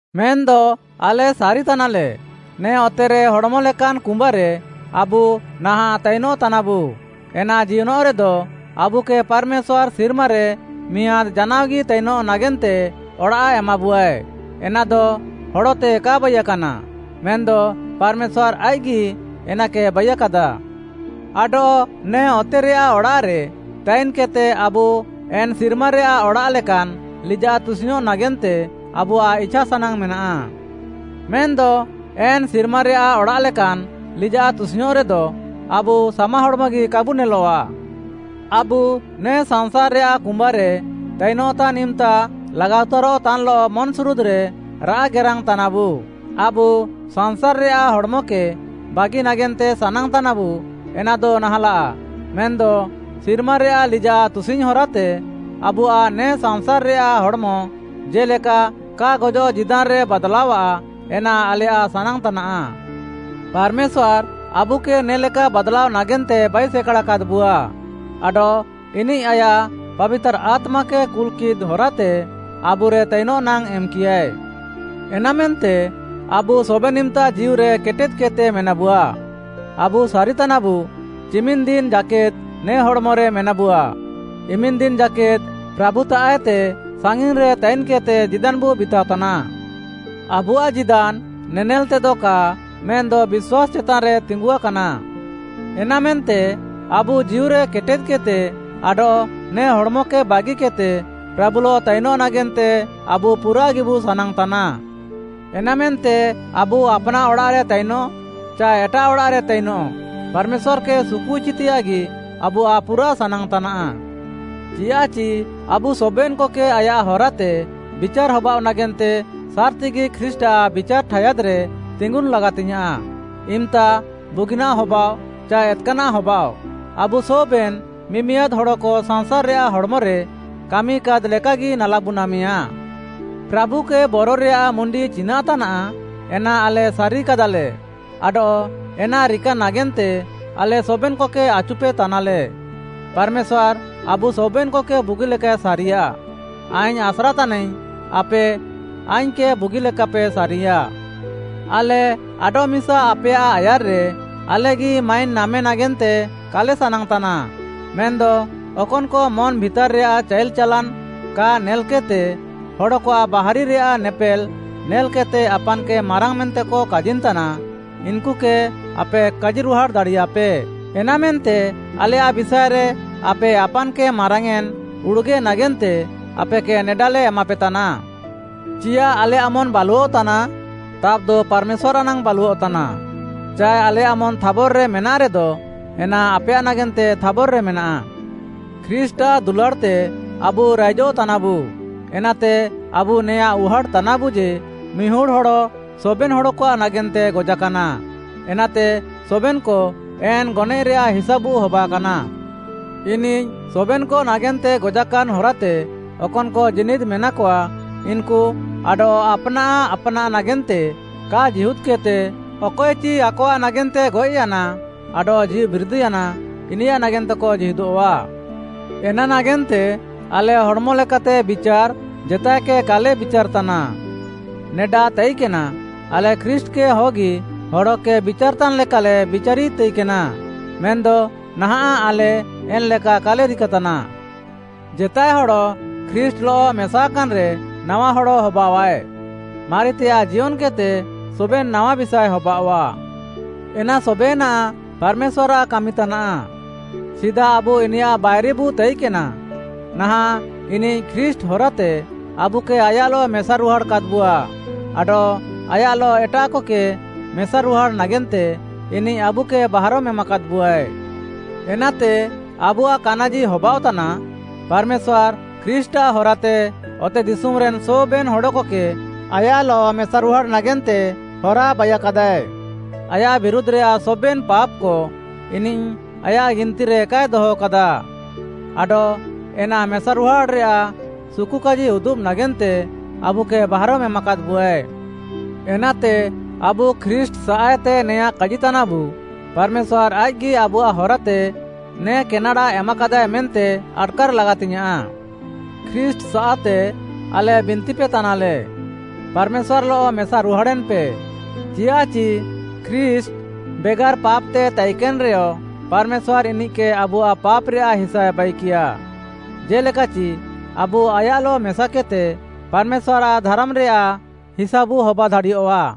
ମେନ୍‌ଦ ଆଲେ ସାରିତାନାଲେ, ନେ ଅତେରେ ହଡ଼୍‌ମ ଲେକାନ୍‌ କୁମ୍ବାରେ ଆବୁ ନାହାଁଃ ତାଇନଃତାନାବୁ, ଏନା ଜିୟନଃରେଦ, ଆବୁକେ ପାର୍‌ମେଶ୍ୱାର୍‌ ସିର୍ମାରେ ମିଆଁଦ୍‌ ଜାନାଅଗି ତାଇନଃ ନାଗେନ୍ତେ ଅଡ଼ାଃ ଏମାବୁଆଏ। ଏନାଦ ହଡ଼ତେ କା ବାଇକାନା, ମେନ୍‌ଦ ପାର୍‌ମେଶ୍ୱାର୍‌ ଆଇଃକ୍‌ଗି ଏନାକେ ବାଇୟାକାଦା। ଆଡଃ ନେ ଅତେରେୟାଃ ଅଡ଼ାଃରେ ତାଇନ୍‌କେଦ୍‌ତେ ଆବୁ ଏନ୍‌ ସିର୍ମାରେୟାଃ ଅଡ଼ାଃ ଲେକାନ୍‌ ଲିଜାଃ ତୁସିଙ୍ଗ୍‌ଅଃ ନାଗେନ୍ତେ ଆବୁଆଃ ଇଛାସାନାଙ୍ଗ୍‌ ମେନାଃ। ମେନ୍‌ଦ ଏନ୍‌ ସିର୍ମାରେୟାଃ ଅଡ଼ାଃ ଲେକାନ୍‌ ଲିଜାଃ ତୁସିଙ୍ଗ୍‌ଅଁରେଦ, ଆବୁ ସାମା ହଡ଼୍‌ମଗି କାବୁ ନେଲଆଃ। ଆବୁ ନେ ସାଂସାର୍‌ରେୟାଃ କୁମ୍ବାରେ ତାଇନଃତାନ୍‌ ଇମ୍‌ତା ଲାଗାଉତାରଃତାନ୍‌ଲଃ ମନ୍‌ସୁରୁଦ୍‌ରେ ରାଆଃ ଗେରାଙ୍ଗ୍‌ ତାନାବୁ। ଆବୁ ସାଂସାର୍‌ରେୟାଃ ହଡ଼୍‌ମକେ ବାଗି ନାଗେନ୍ତେ ସାନାଙ୍ଗ୍‌ ତାନାବୁ ଏନାଦ ନାହାଁଲାଃ, ମେନ୍‌ଦ ସିର୍ମାରେୟାଃ ଲିଜାଃ ତୁସିଙ୍ଗ୍‌ ହରାତେ ଆବୁଆଃ ନେ ସାଂସାର୍‌ରେୟାଃ ହଡ଼୍‌ମ ଜେ'ଲେକା କା ଗଜଃ ଜୀଦାନ୍‌ରେ ବାଦ୍‌ଲାଅଃଆ, ଏନା ଆଲେୟାଃ ସାନାଙ୍ଗ୍‌ତାନା। ପାର୍‌ମେଶ୍ୱାର୍‌ ଆବୁକେ ନେ'ଲେକା ବାଦ୍‌ଲାଅ ନାଗେନ୍ତେ ବାଇସେକାଡ଼ା କାଦ୍‌ବୁଆ। ଆଡଃ ଇନିଃ ଆୟାଃ ପାବିତାର୍‌ ଆତ୍ମାକେ କୁଲ୍‌କିଃଦ୍‌ ହରାତେ ଆବୁରେ ତାଇନଃ ନାଙ୍ଗ୍‌ ଏମ୍‌କିୟାଏ। ଏନାମେନ୍ତେ ଆବୁ ସବେନ୍‌ ଇମ୍‌ତା ଜୀଉରେ କେଟେଦ୍‌କେଦ୍‌ତେ ମେନାବୁଆ, ଆବୁ ସାରି ତାନାବୁ, ଚିମିନ୍‌ ଦିନ୍‌ ଜାକେଦ୍‌ ନେ ହଡ଼୍‌ମରେ ମେନାବୁଆ, ଇମିନ୍‌ ଦିନ୍‌ ଜାକେଦ୍‌ ପ୍ରାଭୁତାଃଏତେ ସାଙ୍ଗିନ୍‌ରେ ତାଇନ୍‌କେଦ୍‌ତେ ଜୀଦାନ୍‌ବୁ ବିତାଅ ତାନା। ଆବୁଆଃ ଜୀଦାନ୍‌ ନେନେଲ୍‌ତେଦ କା ମେନ୍‌ଦ ବିଶ୍ୱାସ୍‌ ଚେତାନ୍‌ରେ ତିଙ୍ଗୁଆକାନା। ଏନାମେନ୍ତେ ଆବୁ ଜୀଉରେ କେଟେଦ୍‌କେଦ୍‌ତେ, ଆଡଃ ନେ ହଡ଼୍‌ମକେ ବାଗିକେଦ୍‌ତେ ପ୍ରାଭୁଲଃ ତାଇନଃ ନାଗେନ୍ତେ ଆବୁ ପୁରାଃଗିବୁ ସାନାଙ୍ଗ୍‌ତାନା। ଏନାମେନ୍ତେ ଆବୁ ଆପ୍‌ନାଃ ଅଡ଼ାଃରେ ତାଇନଃ ଚାଏ ଏଟାଃ ଅଡ଼ାଃରେ ତାଇନଃ, ପାର୍‌ମେଶ୍ୱାର୍‌କେ ସୁକୁଇଚିତେୟାଃଗି ଆବୁଆଃ ପୁରାଃ ସାନାଙ୍ଗ୍‌ତାନା। ଚିୟାଃଚି ଆବୁ ସବେନ୍‌କକେ ଆୟାଃ ହରାତେ ବିଚାର୍‌ ହବାଅଃ ନାଗେନ୍ତେ ସାର୍‌ତିଗି ଖ୍ରୀଷ୍ଟ୍‌ଆଃ ବିଚାର୍‌ ଠାୟାଦ୍‌ରେ ତିଙ୍ଗୁନ୍‌ ଲାଗାତିୟାଃଁ। ଇମ୍‌ତା ବୁଗିନାଃ ହବାଃଅ ଚାଏ ଏତ୍‌କାନାଃ ହବାଅଃ, ଆବୁ ସବେନ୍‌ ମିମିଆଦ୍‌ ହଡ଼କ ସାଂସାର୍‌ରେୟାଃ ହଡ଼୍‌ମରେ କାମିକାଦ୍‌ ଲେକାଗି ନାଲାବୁ ନାମେୟା। ପ୍ରାଭୁକେ ବର ରେୟାଃ ମୁଣ୍ଡି ଚିନାଃ ତାନାଃ, ଏନା ଆଲେ ସାରି କାଦାଲେ ଆଡଃ ଏନା ରିକା ନାଗେନ୍ତେ ଆଲେ ସବେନ୍‌କକେ ଆଚୁପେତାନାଲେ। ପାର୍‌ମେଶ୍ୱାର୍‌ ଆବୁ ସବେନ୍‌କକେ ବୁଗିଲେକାଏ ସାରିୟା। ଆଇଙ୍ଗ୍‌ ଆସ୍ରା ତାନାଇଙ୍ଗ୍‌, ଆପେ ଆଇଙ୍ଗ୍‌କେ ବୁଗି ଲେକାପେ ସାରିୟା। ଆଲେ ଆଡଃମିସା ଆପେୟାଃ ଆୟାର୍‌ରେ ଆଲେଗି ମାଇନ୍‌ ନାମେ ନାଗେନ୍ତେ କାଲେ ସାନାଙ୍ଗ୍‌ତାନା, ମେନ୍‌ଦ ଅକନ୍‌କ ମନ୍‌ ଭିତାର୍‌ରେୟାଃ ଚାଇଲ୍‌ ଚାଲାନ୍‌ କା ନେଲ୍‌କେଦ୍‌ତେ ହଡ଼କଆଃ ବାହାରି ରେୟାଃ ନେପେଲ୍‌ ନେଲ୍‌କେଦ୍‌ତେ ଆପାନ୍‌କେ ମାରାଙ୍ଗ୍‌ ମେନ୍ତେକ କାଜିନ୍‌ତାନା, ଇନ୍‌କୁକେ ଆପେ କାଜିରୁହାଡ଼୍‌ ଦାଡ଼ିୟାପେ। ଏନାମେନ୍ତେ ଆଲେୟାଃ ବିଷାଏରେ ଆପେ ଆପାନ୍‌କେ ମାରାଙ୍ଗ୍‌ୟେଁନ୍‌ ଉଡ଼ୁଗେ ନାଗେନ୍ତେ ଆପେକେ ନେଡାଲେ ଏମାପେତାନା। ଚିୟାଃ ଆଲେୟାଃ ମନ୍‌ ବାଲୁଅଃତାନା? ତାବ୍‌ଦ ପାର୍‌ମେଶ୍ୱାର୍‌ ନାଙ୍ଗ୍‌ ବାଲୁଅଃତାନା। ଚାଏ ଆଲେୟାଃ ମନ୍‌ ଥାବର୍‌ରେ ମେନାଃରେଦ, ଏନା ଆପେୟାଃ ନାଗେନ୍ତେ ଥାବର୍‌ରେ ମେନାଃ। ଖ୍ରୀଷ୍ଟ୍‌ଆଃ ଦୁଲାଡ଼୍‌ତେ ଆବୁ ରାଇଜଃ ତାନାବୁ। ଏନାତେ ଆବୁ ନେଆଁ ଉହାଟ୍‌ତାନାବୁ ଯେ, ମିହୁଡ଼୍‌ ହଡ଼ ସବେନ୍‌ ହଡ଼କଆଃ ନାଗେନ୍ତେ ଗଜାକାନା, ଏନାତେ ସବେନ୍‌କ ଏନ୍‌ ଗନଏଃରେୟାଃ ହିସାବୁ ହବାକାନା। ଇନିଃ ସବେନ୍‌କ ନାଗେନ୍ତେ ଗଜାକାନ୍‌ ହରାତେ ଅକନ୍‌କ ଜୀନିଦ୍‌ ମେନାକଆ, ଇନ୍‌କୁ ଆଡଃ ଆପ୍‌ନାଃ ଆପ୍‌ନାଃ ନାଗେନ୍ତେ କା ଜୀହୁଦ୍‌କେଦ୍‌ତେ, ଅକଏଚି ଆକଆଃ ନାଗେନ୍ତେ ଗଏଃୟାନା ଆଡଃ ଜୀଉବିରିଦ୍‌ୟାନା, ଇନିୟାଃ ନାଗେନ୍ତେକ ଜୀହୁଦଃଆ। ଏନା ନାଗେନ୍ତେ ଆଲେ ହଡ଼୍‌ମ ଲେକାତେ ବିଚାର୍‌, ଜେତାଏକେ କାଲେ ବିଚାର୍‌ ତାନା। ନେଡା ତାଇକେନା ଆଲେ ଖ୍ରୀଷ୍ଟ୍‌କେ ହଗି ହଡ଼କେ ବିଚାର୍‌ ତାନ୍‌ ଲେକାଲେ ବିଚାରି ତାଇକେନା। ମେନ୍‌ଦ ନାହାଁଃ ଆଲେ ଏନ୍‌ଲେକା କାଲେ ରିକାତାନା। ଜେତାଏ ହଡ଼ ଖ୍ରୀଷ୍ଟ୍‌ଲଃ ମେସାକାନ୍‌ରେ, ନାୱା ହଡ଼ ହବାଅଃଆଏ। ମାରିତେୟାଃ ଜିୟନ୍‌କେଦ୍‌ତେ ସବେନ୍‌ ନାୱା ବିଷାଏ ହବାଅଆଃ। ଏନା ସବେନାଃ ପାର୍‌ମେଶ୍ୱାର୍‌ଆଃ କାମିତାନା। ସିଦା ଆବୁ ଇନିୟାଃ ବାଇରିବୁ ତାଇକେନା, ନାହାଁଃ ଇନିଃ ଖ୍ରୀଷ୍ଟ୍‌ ହରାତେ ଆବୁକେ ଆୟାଃଲଃ ମେସାରୁହାଡ଼୍‌ କାଦ୍‌ବୁଆ ଆଡଃ ଆୟାଃଲଃ ଏଟାଃକକେ ମେସାରୁହାଡ଼୍‌ ନାଗେନ୍ତେ ଇନିଃ ଆବୁକେ ବାହାରମ୍‌ ଏମାକାଦ୍‌ବୁଆଏ। ଏନାତେ ଆବୁଆଃ କାନାଜି ହବାଅଃତାନା, ପାର୍‌ମେଶ୍ୱାର୍‌, ଖ୍ରୀଷ୍ଟ୍‌ଆଃ ହରାତେ ଅତେଦିଶୁମ୍‌ରେନ୍‌ ସବେନ୍‌ ହଡ଼କକେ ଆୟାଃଲଃ ମେସାରୁହାଡ଼୍‌ ନାଗେନ୍ତେ ହରା ବାଇୟାକାଦାଏ। ଆୟାଃ ବିରୁଧ୍‌ରେୟାଃ ସବେନ୍‌ ପାପ୍‌କ ଇନିଃ ଆୟାଃ ଗିନ୍‌ତିରେ କାଏ ଦହକାଦା। ଆଡଃ ଏନ୍‌ ମେସାରୁହାଡ଼୍‌ ରେୟାଃ ସୁକୁକାଜି ଉଦୁବ୍‌ ନାଗେନ୍ତେ ଆବୁକେ ବାହାରମ୍‌ ଏମାକାଦ୍‌ବୁଆଏ। ଏନାତେ, ଆବୁ ଖ୍ରୀଷ୍ଟ୍‌ସାଃଏତେ ନେଆଁଁ କାଜିତାନାବୁ, ପାର୍‌ମେଶ୍ୱାର୍‌ ଆଇଃକ୍‌ଗି ଆବୁଆଃ ହରାତେ ନେ କେନେଡ଼ା ଏମାକାଦାଏ ମେନ୍ତେ ଆଟ୍‌କାର୍‌ ଲାଗାତିଙ୍ଗ୍‌ୟାଁଃ। ଖ୍ରୀଷ୍ଟ୍‌ସାଃତେ ଆଲେ ବିନ୍ତିପେ ତାନାଲେ, ପାର୍‌ମେଶ୍ୱାର୍‌ଲଃ ମେସାରୁହାଡ଼େନ୍‌ପେ, ଚିୟାଃଚି ଖ୍ରୀଷ୍ଟ୍‌, ବେଗାର୍‌ ପାପ୍‌ତେ ତାଇକେନ୍‌ରେୟ, ପାର୍‌ମେଶ୍ୱାର୍‌ ଇନିଃକେ ଆବୁଆଃ ପାପ୍‌ରେୟାଃ ହିସାଏ ବାଇକିୟା, ଜେ'ଲେକାଚି ଆବୁ ଆୟାଃଲଃ ମେସାକେଦ୍‌ତେ ପାର୍‌ମେଶ୍ୱାର୍‌ଆଃ ଧାର୍‌ମାନ୍‌ରେୟାଃ ହିସାବୁ ହବା ଦାଡ଼ିୟଃଆ।